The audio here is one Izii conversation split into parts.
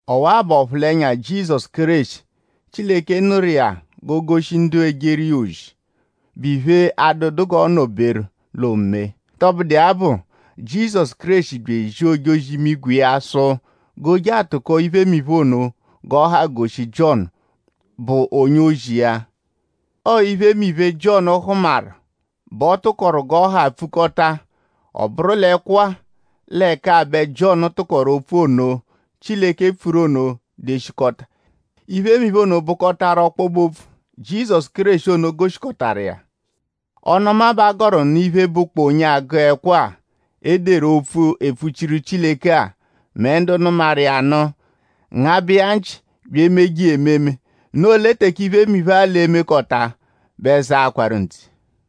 Ọwa-a bụ ọphulenya Jizọsu Kéreshi, Chileke nụru iya g'o goshi ndu ejeru iya ozi, bụ iphe, adụedu g'ọo-nọ-beru l'oomee. Tọbudu iya bụ; Jizọsu Kéreshi bya ezia ojozi-imigwe iya sụ g'o je atụko iphe ono g'ọ ha goshi Jiọnu, bụ onye-ozi iya. Ọo iphemiphe, Jiọnu hụmaru bẹ ọ tụkoru g'ọ ha pfukọta-a. Ọ bụru l'ẹkwo-a l'ẹka-a bẹ Jiọnu tụkoru opfu ono, Chileke pfuru ono deshikọta. Iphemiphe ono bụkotaru ọkpobe-opfu, Jizọsu Kéreshi ono goshikọtaru iya. Ọnu-ọma bẹ a gọru nụ iphe, bụ onye agụ ẹkwo-a, e deru opfu, epfuchiru Chileke-a mẹ ndu nụmaru iya nụ; ngabẹ iya nchị bya emeje iya ememe; noo lẹ teke iphemiphe-a l'e-mekọta bẹ zaakwaru ntse.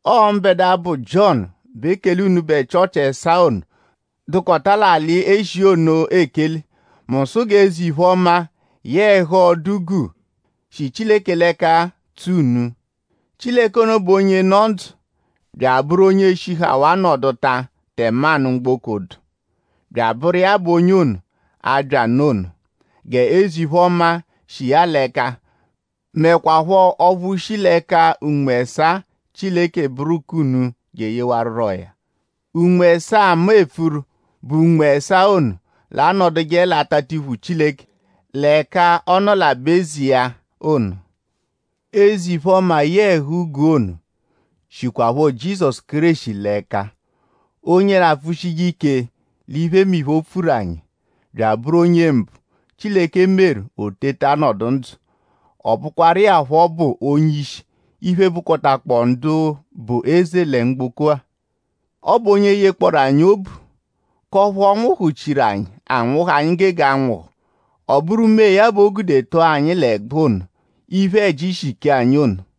Ọo mbẹdua, bụ Jiọnu bẹ ekele unubẹ Chịochi ẹsaa ono, dụkota l'alị Eshiya ono ekele. Mu sụ g'eze-iphe-ọma yẹe ẹhu ọdu guu, shi Chileke l'ẹka tso unu. Chileke ono bụ onye nọ ndzụ; bya abụru onye shihawaa nọduta tẹmanu mgboko dụ; bya abụru iya bụ onye ono, abya nụ ono. G'eze-iphe-ọma, shi iya l'ẹka; mẹkwapho ọphu shi l'ẹka Unme ẹsaa Chileke bụru k'unu jeyewarurọya. Unme ẹsaa, mu epfuru bụ Unme ẹsaa ono, l'anọduje l'atatiphu Chileke l'ẹka ọ nọ l'aba-eze iya ono. Eze-iphe-ọma yẹe ẹhu-guu ono shikwaphọ Jizọsu Kéreshi l'ẹka onye l'apfụshije ike l'iphemiphe, o pfuru anyi; bya abụru onye mbụ, Chileke meru o teta nọdu ndzụ. Ọ bụkwaru iya phọ bụ onye-ishi iphe, bụkotakpoo ndu bụ eze lẹ mgboko-a. Ọ bụ onye yekpọoru anyi obu; k'ọphu ọ nwụhu-chiru anyi anwụhu, anyi gege anwụhu. Ọ bụru mee ya b'o gude tọo anyi l'ẹgbu ono, iphe-ẹji shi kee anyi ono.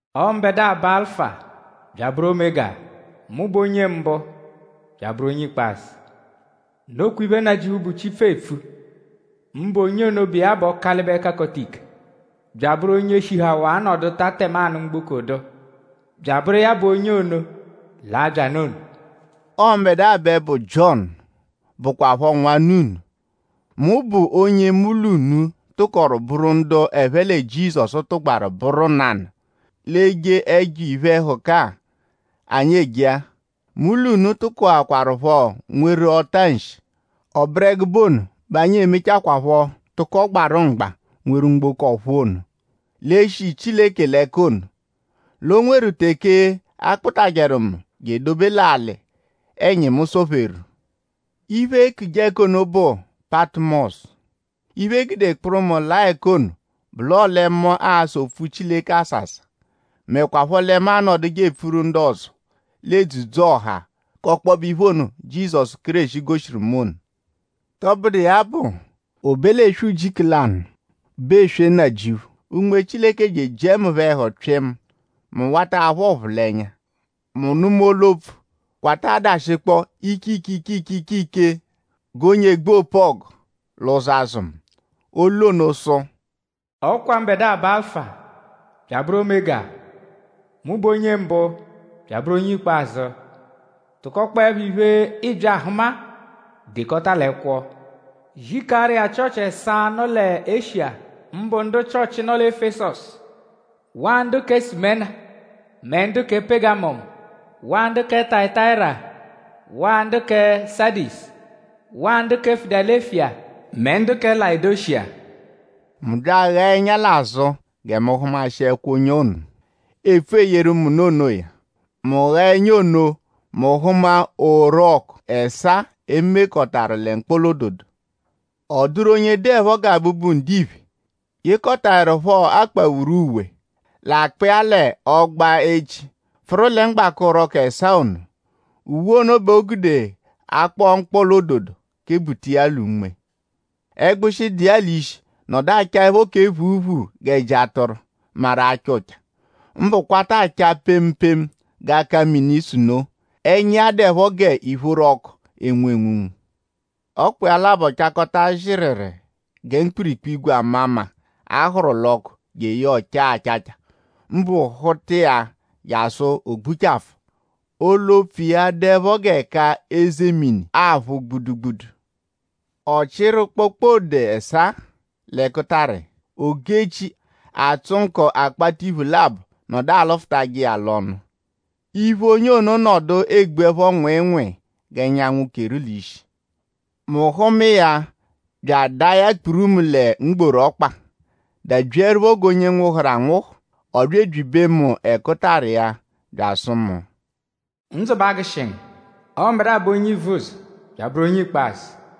“Ọ mbẹdua bụ Alụfa bya abụru Omega. Mu bụ onye mbụ bya abụru onye ikpazụ.” Nokwa iphe, Nnajịuphu, bụ Chipfu eepfu; mbụ onye ono, bụ iya bụ Ọkalibe-Kakọta-Ike; bya abụru onye shihawaa nọduta tẹmanu mgboko dụ; bya abụru iya bụ onye ono, l'abya nụ ono. Ọo mbẹdua bẹ bụ Jiọnu, bụkwapho nwanna unu. Mu bụ onye mu l'unu tụkoru bụru ndu ẹphe lẹ Jizọsu tụgbaru bụru nanụ l'eje ẹjo iphe-ẹhuka-a, anyi eje-a. Mu l'unu tụkokwarupho nweru ọta-nshi. Ọ bụru ẹgube ono bẹ anyi e-mechakwaphọ tụko gbarụ mgba nweru mgboko ọ̀phúú ono, l'e-shi Chileke l'ẹka ono. L'o nweru teke a kpụtajeru mu je edobe l'alị, ẹnyimu sọ-pheru. Iphe, eekuje ẹka ono bụ Patụmosu. Iphe, e gude kpụru mu laa ẹka ono bụ l'ọle mu asa opfu Chileke asasa; mẹkwapho lẹ mu anọduje epfuru ndu ọzo l'edzudzu-ọha k'ọkpobe iphe ono, Jizọsu Kéreshi goshiru mu ono. Tọbudu iya bụ; o be l'eswe ujiku lanụ, bụ eswe Nnajịuphu; Unme Chileke bya ejiẹ mu phọ ẹhu pyịmu. Mu wata aphụ ọphulenya. Mu nụma olu-opfu, kwata adashikpọ ike ike ike ike g'onye egbu opu-ọgu l'ụzo azụ mu. Olu ono sụ: “Ọ kwa mbẹdua bụ Alụfa bya abụru Omega; mu bụ onye mbụ bya abụru onye ikpazụ. Tụkokpoepho iphe, ịibya ahụma-a dekọta l'ẹkwo; zikaaru Chịochi ẹsaa-a, nọ lẹ Eshiya; mbụ ndu Chịochi, nọ lẹ Efesọsu; waa ndu kẹ Sumena; mẹ ndu kẹ Pegamọmu; waa ndu kẹ Tayatayira; waa ndu kẹ Sadisu; waa ndu kẹ Filadelufiya; mẹ ndu kẹ Layodeshiya.” Mu bya aghaa ẹnya l'azụ gẹ mu hụmaeshikwa onye ono, epfu eyeru mu nụ onoya. Mu ghaa ẹnya ono mu hụma orọku ẹsaa e mekọtaru lẹ mkpọla-ododo. Ọ dụru onye dụepho gẹ Abụbu-Ndiphe, yekọtaerupho akpawuru uwe, l'akpa iya l'ọgba-echi pfụru lẹ mgbaka orọku ẹsaa ono. Uwe ono bẹ e gude akpọ-mkpọla-ododo kebuta iya l'unme. Ẹgbushi, dụ iya l'ishi nọdu achaẹpho kẹ phuuphuu g'ẹji atụru, maru acha ụcha; mbụ kwata acha pemu pemu g'aka-mini-sunoo. Ẹnya iya dụepho g'ìphóró ọku, enwu enwunwu. Ọkpa iya labọ chakọta zịriri gẹ mkpụrukpu-ígwè, ama mma, a hụru l'ọku jeye ọ chaa achacha; mbụ hụta iya jasụ o gbuchafụ. Olu-opfu iya dụepho g'ẹka eze mini aphụ gbudugbudu. Ọ chịru kpokpode ẹsaa l'ẹkutara iya. Ogu-echi, atsụ nkọ akpatiphu labọ nọdu alụfutaje iya l'ọnu. Iphu onye ono nọdu egbuẹpho nwịinwii g'ẹnyanwu keru l'ishi. Mu hụma iya bya adaa ya kpurumu lẹ mgboru ọkpa; dabyiẹrupho g'onye nwụhuru anwụhu. Ọ bya ebyibe mu ẹkutara iya bya asụ mu: “Ndzụ b'agụshi ngu. Ọo mbẹdua bụ Onye Ivuzọ bya abụru Onye Ikpazụ.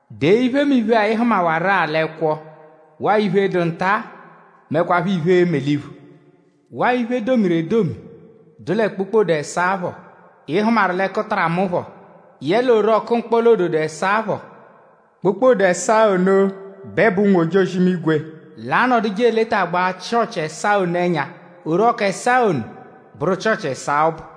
Dee iphemiphe-a, ị hụmawaru-a l'ẹkwo waa iphe, dụ nta-a; mẹkwapho iphe, e-me l'iphu. Waa iphe, e domiru edomi dụ lẹ kpokpode ẹsaa-a phọ, ị hụmaru l'ẹkutara mu phọ; yẹle orọku mkpọla-ododo ẹsaa phọ. Kpokpode ẹsaa ono bẹ bụ ụnwu-ojozi-imigwe, l'anọduje eletagbaa Chịochi ẹsaa ono ẹnya; orọku ẹsaa ono bụru Chịochi ẹsaa ọbu.”